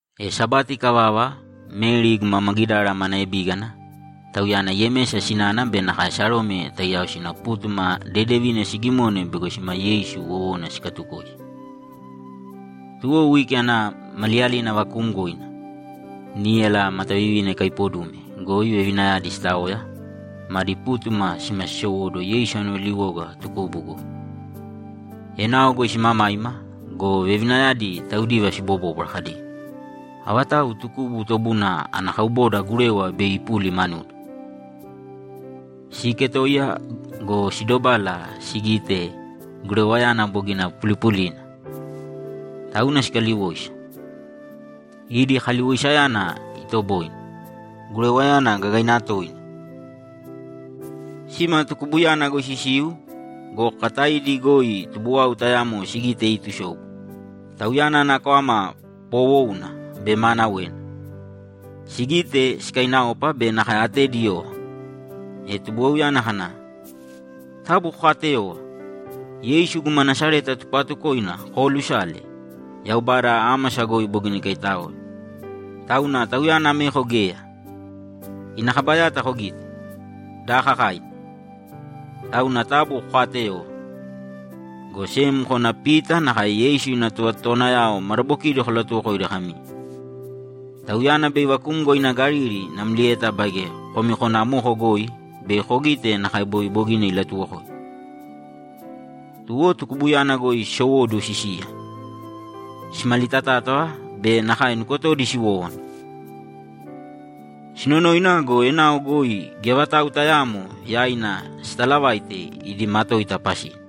E Sabati ikavava, Meri guma Magidara mana ebígana, tauyana Yemesa sinana be nakae Sarome taiyao sina pútuma dedevina sigimone bego sima Yeisu wowona sikatukoisi. Tuwo wiki ana maliyalina vakuumgoina, níyala matavivina ikaipodume goi vevinayadi sitaoya, madi pútuma sima sisowóduwo Yeisu ana valiwoga tukubu goi. Enao goi simamaima go, vevinayadi taudiva sibobóbwara kadi, ‘Avatau tukubu tobuna ana kauboda gurewa bei ipuli manuda?’ Siiketoiya go, sidobala sigite gurewayana bogina pulipulina! Tauna sikaliwoisa. Idi kaliwoisayana itoboine. Gurewayana gagaina toina! Sima tukubuyana goi sisiu go, kakataidi goi tubuwau tayamo sigite iitusobu. Tauyana ana kwama poowouna be maanawena. Sigite, sikainaopa be nakae atedi iyova. E tubuwauyana kana, ‘Taabu kokaateyōva! Yeisu guma Nasareta tupaatukoina koolusale. Yaubada ámasa goi bogina ikaitáoe. Tauna Tauyana ameko geya. Ina kaba yata kogīte, daakakaina! Tauna taabu kokaateyōva, go sem kōna Pita nakae Yeisu ina tovatotowanayao madabokidi kolatuwokōidi kami, “Tauyana bei ivakumgo ina Galili namlieta baige komi kōna amoko goi bei kogite nakae boi bogina ilatuwokoimi.”’ Tuwo tukubuyana goi sisowóduwo sisiya. Simalitatátava be nakae nukotodi siwówana. Sinonoina go, enao goi geya vatau tayaamo yaina sitalavaite idi matoita pasina. [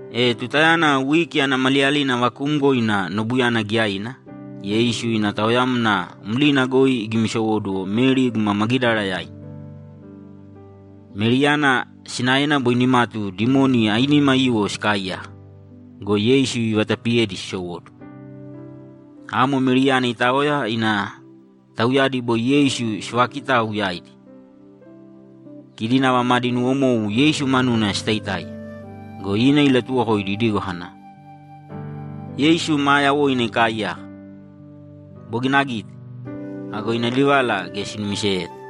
E tutayana wiki ana maliyalina vakuumgoina nobuyana giyaina, Yeisu ina taoyamna mlina goi igimisowóduwo Meri guma Magidara yaina. Meriyana sinaena boi nimatu dimoni ainima aiyuwo sikaaiyaka go, Yeisu ivatapiyedi sisowóduwo. Amo Meriyana itaoya ina tauyadi boi Yeisu sivaakitau yaidi. Kidi nava madi nuwomou Yeisu manuna sitaitáiya go, ina ilatuwokoidi idigo kana, ‘Yeisu maa yawoina ikaaiyaka. Bogina agite!’ Ago ina livala geya sinumiseyeta.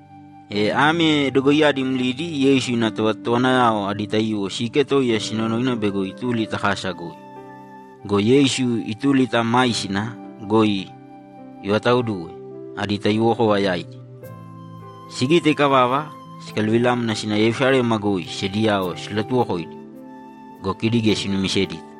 E ame dogoiyadi mlidi Yeisu ina tovatotowanayao adi taiyuwo siiketoiya sinonoina bego ituli ta kasa goi go, Yeisu ituli ta maisina goi ivataoduwe adi taiyuwokova yaidi. Sigite ikavava, sikaluvilamna sina Yerusalema goi sediyao silatuwokoidi go, kidi geya sinumisedita.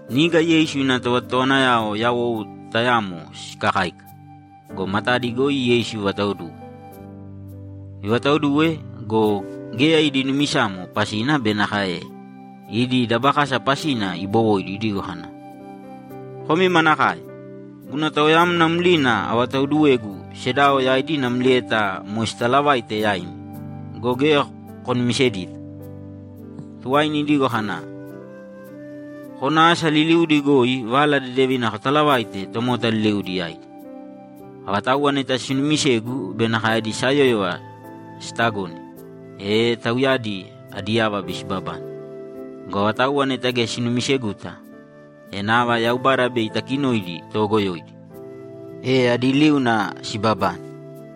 Niga Yeisu ina tovatotowanayao yawou tayamo sikakáika go, matadi goi Yeisu ivataoduwe. Ivataoduwe go, geya idi numisamo pasina be nakae idi dabakasa pasina ibowoidi idigo kana, ‘Komi manakae! Guna taoyamna mlina avataoduwegu sedao yaidi namlieta moe sitalavaite yaimi go, geya konumisedita!’ Tuwaina idigo kana, ‘Kōna asa liliudi goi Vala Dedevina kotalavāite tomota liliudi yaidi. Avatauwa neta sinuumisegu be nakae adi sayóyova sitagone, e tauyadi adi yava bei sibabane. Go avatauwa neta geya sinumiseguta, e nava Yaubada bei itakinoidi toogoyoidi, e adi liuna sibabane.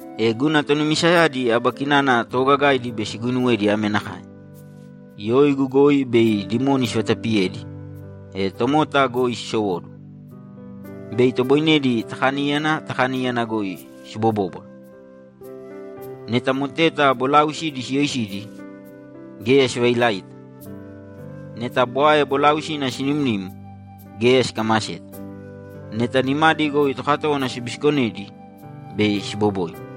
E guna tonumisayadi aba kinana toogagaidi bei siguinuwedi ame nakae: Yoigu goi bei dimoni sivatapiyedi, e tomota goi sisowóduwo. Bei itoboinedi ta kaníyana ta kaníyana goi sibobóbwara. Neta moteta bolaausidi siyoisidi, geya sivailaita. Neta bwae bolaausina sinimnim, geya sikamaseta. Neta nimadi goi tokatówana sibisikonedi, bei siboboina.’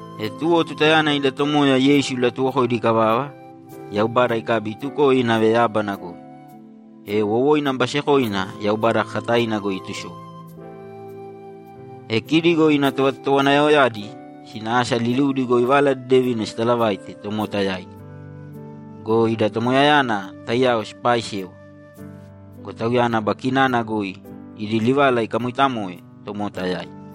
E tuwo tutayana ida Tomoya Yeisu ilatuwokoidi ikavava, Yaubada ikabi itukoe inave yábana goi, e wowoina basekoina Yaubada kakataina goi itusobu. E kidi go ina tovatotowanayaoyadi sina asa liliudi goi Vala Dedevina sitalavaite tomota yaidi go, ida Tomoyayana taiyao sipaaisewa. Go Tauyana aba kinana goi idi livala ikamoitamoe tomota yaidi.]